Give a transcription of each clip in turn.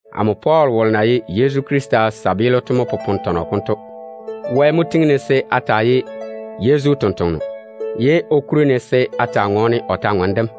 Amo Pɔɔl wolo na ye Yezu Krista kabaa to mo popone tɔnɔ konto. Wɛ mo tiŋi-ne se a taa ye Yezu totoŋa nakwe, ye o kuri-ne se a taa tɔɔle o kwor-ywoŋa kam.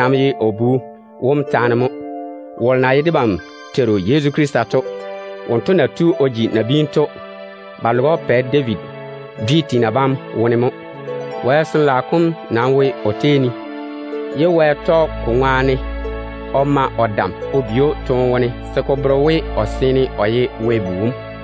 Ka ye o Bu wom taane mo, wolo na ye debam Teiru Yezu Krista to. Wonto na jigi nabiinu to, ba loge‑o Pɛ David dwi tiina bam wone mo. Wɛ Sin-laao kom nam wo o tei ne de dam, ye Wɛ tɔge ko ŋwaane o bi‑o toone wone se ko bere we o seene o ye Wɛ Bu wom.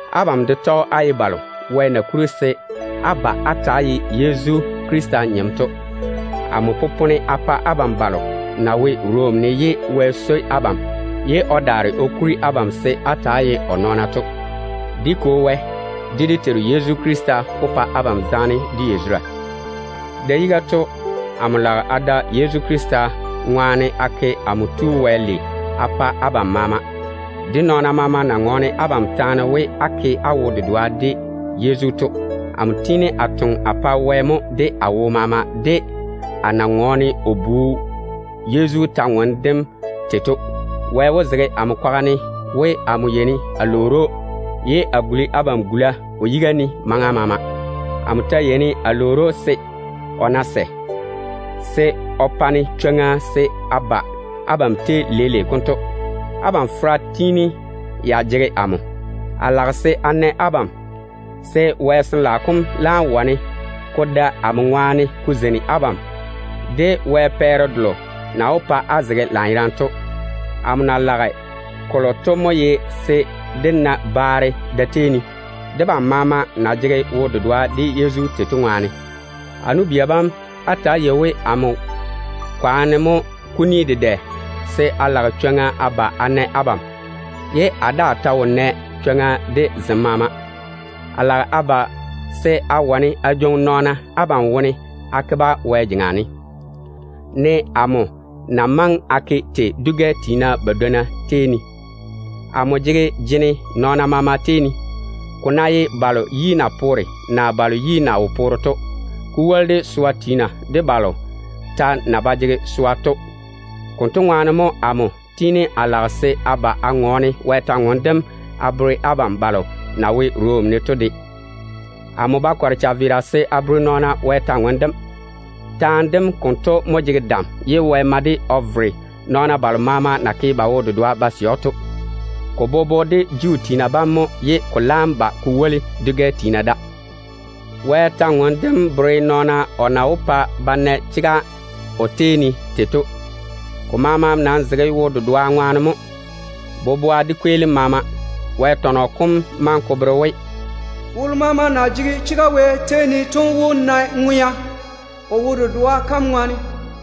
Abam de tɔge á ye balo Wɛ na kuri se á ba á ta‑á ye Yezu Krista nyem to mo. Amo popone a pa abam balo na wo Rom ne ye Wɛ swoi abam pa se o kuri abam se á ta‑á ye o nɔɔna to. Dé Kwo Wɛ, de dé Teiru Yezu Krista wó pa abam zaane de yazura. Da-yiga to, amo lage a da Yezu Krista ŋwaane a ke amo Tu Wɛ lei a pa abam maama, de nɔɔna na ŋɔɔne abam taane jei maama ne we á ke á wo-dedoa de Yezu to. Amo tiini a toŋe a pa Wɛ mo de a wo maama de a na tɔɔle o Bu Yezu kwor-ywoŋa kam tei to. Wɛ wó zege amo kwaga ne we, amo yeini a lwoori‑o, ye a guli abam gula o yiga ne maŋa maama. Amo ta yeini a lwoori‑o se, o ná sɛ, se o pa-ne chwoŋa se a ba abam tei leile konto. Abam fera tiini ya jege amo. A lage se a na abam, se Wɛ Sin-laao kom laam wane ko da amo ŋwaane ko zeini abam de Wɛ pɛɛre delo na wó pa á ta‑á jege dam to. Amo na lage kolo to mo ye se dé na baare da-tei ne, debam maama na jege wo-dedoa de Yezu to ŋwaane. A nu-bia bam, lɔre-na we amo kwaane mo kuni dedɛ se a lage chwoŋa a ba a na abam, ye a daa ta wo nɛ chwoŋa de zem maama. A lage a ba se a wane a jwoŋi nɔɔna abam wone a ke-ba Wɛ jeŋa ne, ne amo na maŋe a ke tei dwi-gɛ tiina badwonna tei ne to. Amo jege jene nɔɔna maama tei ne, ko ná ye balo yi na poore, naa balo yi na wo poore to, ko woli de swa tiina de balo ta na ba jege swa to. Konto ŋwaane mo amo tiini a lage se a ba a tɔɔle Wɛ kwor-ywoŋa kam a bere abam balo na wo Rom ne to de. Amo ba kɔre chaveera se a bere nɔɔna Wɛ kwor-ywoŋa kam. Wɛ kwora kam konto mo jege dam ye Wɛ tɔge ka ŋwaane o vere nɔɔna balo maama na ke ba wo-dedoa ded‑o to, ko bobo de Juu tiina bam mo ye ko laam ba ko woli dwi-gɛ tiina da. Ka ta bere nɔɔna Wɛ na wó ke tei o pa ba na chega o tei ne to. Ko maama nam zege wo-dedoa ŋwaane mo, boboa de kweelim maama. Wɛ tɔnɔ kom maŋe ko bere we, “Wolo maama na jege chega Wɛ tei ne to wó na ŋwea o wo-dedoa kam ŋwaane.”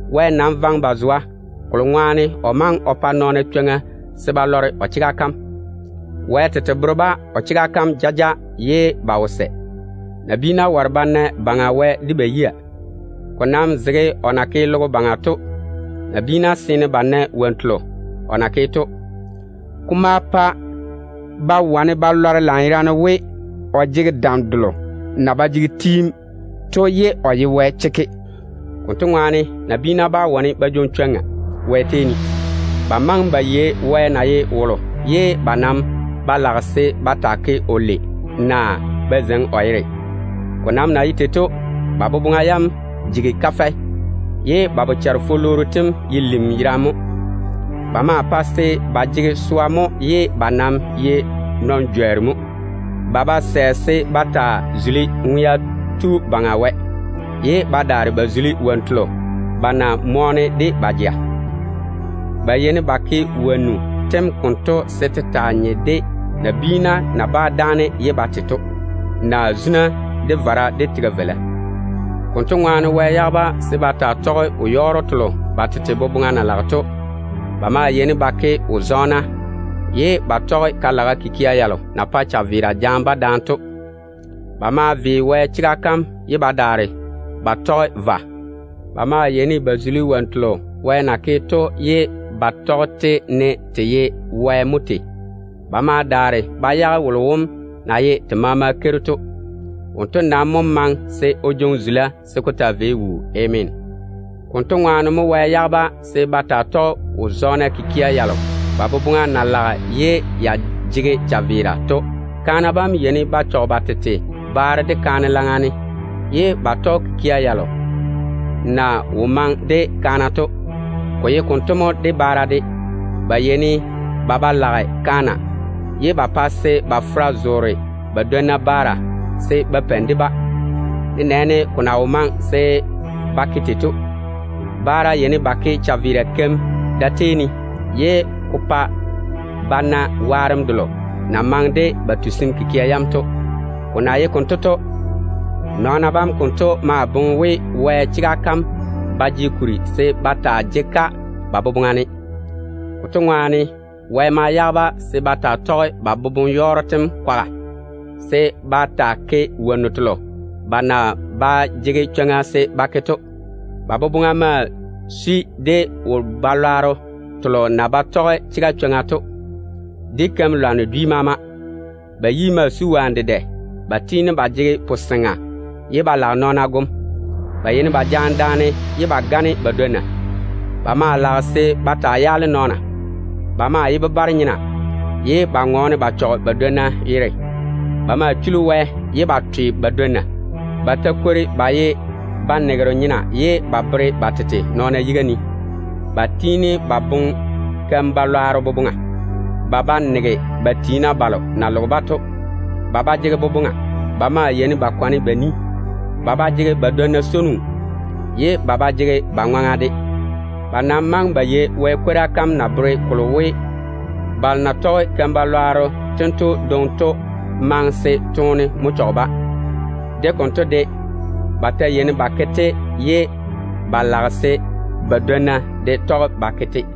Wɛ nam vaŋe ba zwa, kolo ŋwaane o maŋe o pa nɔɔna chwoŋa se ba lɔre o chega kam. Wɛ tete bere-ba o chega kam jaja ye ba wo sɛ. Nabiina ware se ba na Baŋa Wɛ de ba yia. Ko nam zege o na ke logo baŋa to, nabiina seene ba nae wonnu telo o na naane to. Ko ma pa ba wane ba lɔre lanyerane we o jege dam delo na ba jege tiim to ye o ye Wɛ chekke. Konto ŋwaane nabiina bá wane ba jwoŋi chwoŋa Wɛ tei ne. Ba maŋe ba yei Wɛ na ye wolo to, ye ba nam ba lage se ba taa ke‑o lei, naa ba zeiŋi o yere dem wɛɛne. Ko nam na ye tei to, ba boboŋa yam jigi kafɛ, ye ba bochare-fulwooru tem ye lim yerane mo. Ba maa pae se ba jege swa, ye ba nam ye nɔn-jworru mo. Ba ba sɛ se ba taa zuli Ŋwea Tu Baŋa Wɛ, ye ba daare ba zuli wonnu telo ba na mɔɔne de ba jea to. Ba yeini ba ke wonnu tem konto se te taa nye de nabiina na bá dáane ye ba te to, naa zuna, de vara, de tega-veila mo. Konto ŋwaane Wɛ yage-ba se ba taa tɔge wo-yɔɔro telo ba tete boboŋa na lage to. Ba maa yeini ba ke wo-zɔɔna, ye ba tɔge ka-laga kikia yalo na pae chaveera jaane-ba to. Ba ve Wɛ chega kam mo ye ba daare ba tɔge vwa. Ba maa yeini ba zuli wonnu telo Wɛ na ke to, ne te ye Wɛ tete mo tei. Ba ma daare ba yage wolo wom na ye te maama Keiru to. Wonto nam mo maŋe se o taa jwoŋi teem taa wuu. Ameena. Konto ŋwaane mo Wɛ yage-ba se ba taa tɔge wo-zɔɔna kikia yalo ba boboŋa na laga ye ya jege chaveera to. Kaana bam yeini ba chɔge ba tete baaro de kaane laŋa ne, pa se ba tɔge kikia yalo na wo maŋe de kaana to. Ko ye konto mo de baara de. Ba yeini ba ba lage kaana, ye ba pae se ba fera zoore ba dwonna baara se ba peini de-ba, nenɛɛne ko na wo maŋe se ba ke tei to. Baara yeini ba ke chaveera keim da-tei ne, ye ko pa ba na waarem delo na maŋe de ba tusim kikia yam to. Ko ta woli da, nɔɔna bam konto maa boŋe we, Wɛ chega kam ba jege kuri se ba taa jege-ka ba boboŋa ne. Konto ŋwaane, Wɛ ma yage-ba se ba taa tɔge ba boboŋ-yɔɔro tem kwaga, se ba taa ke wonnu telo ba na ba jege chwoŋa se ba ke to. Ba boboŋa maa sui de wo-balwaaro telo na ba tɔge chega chwoŋa to, de keim-lwanno dwi maama. Ba yi maa sui wonnu dedɛ. Ba tiini ba jege puseŋa, ye ba lage nɔɔna gom. Ba maa swoi nankɔɔre kikia ye ba gane ba dwonna. Ba maa yeini ba yaale nɔɔna. Ba ye bebare-nyena mo, ye ba ŋɔɔne ba chɔge ba dwonna yere. Ba maa chuli Wɛ, ye ba twe ba dwonna. Ba ta kwori ba ye banegero nyena, ye ba bere ba tete nɔɔna yiga ne. Ba tiini ba boŋe keim-balwaaro boboŋa. Ba ba nege ba tiina. Ba ba jege boboŋa. Ba maa yeini ba kwane ba ni. Ba ba jege ba dwonna swono, ye ba ba jege ba ŋwaŋa de. Ba nam maŋe ba yei Wɛ kwora kam na bere kolo we, balo na tɔge keim-balwaaro tento dwoŋi to maŋe se toone mo chɔge-ba. De konto de, ba ta yeini ba ke-te, ye ba lage se ba dwonna de tɔge ba ke-te.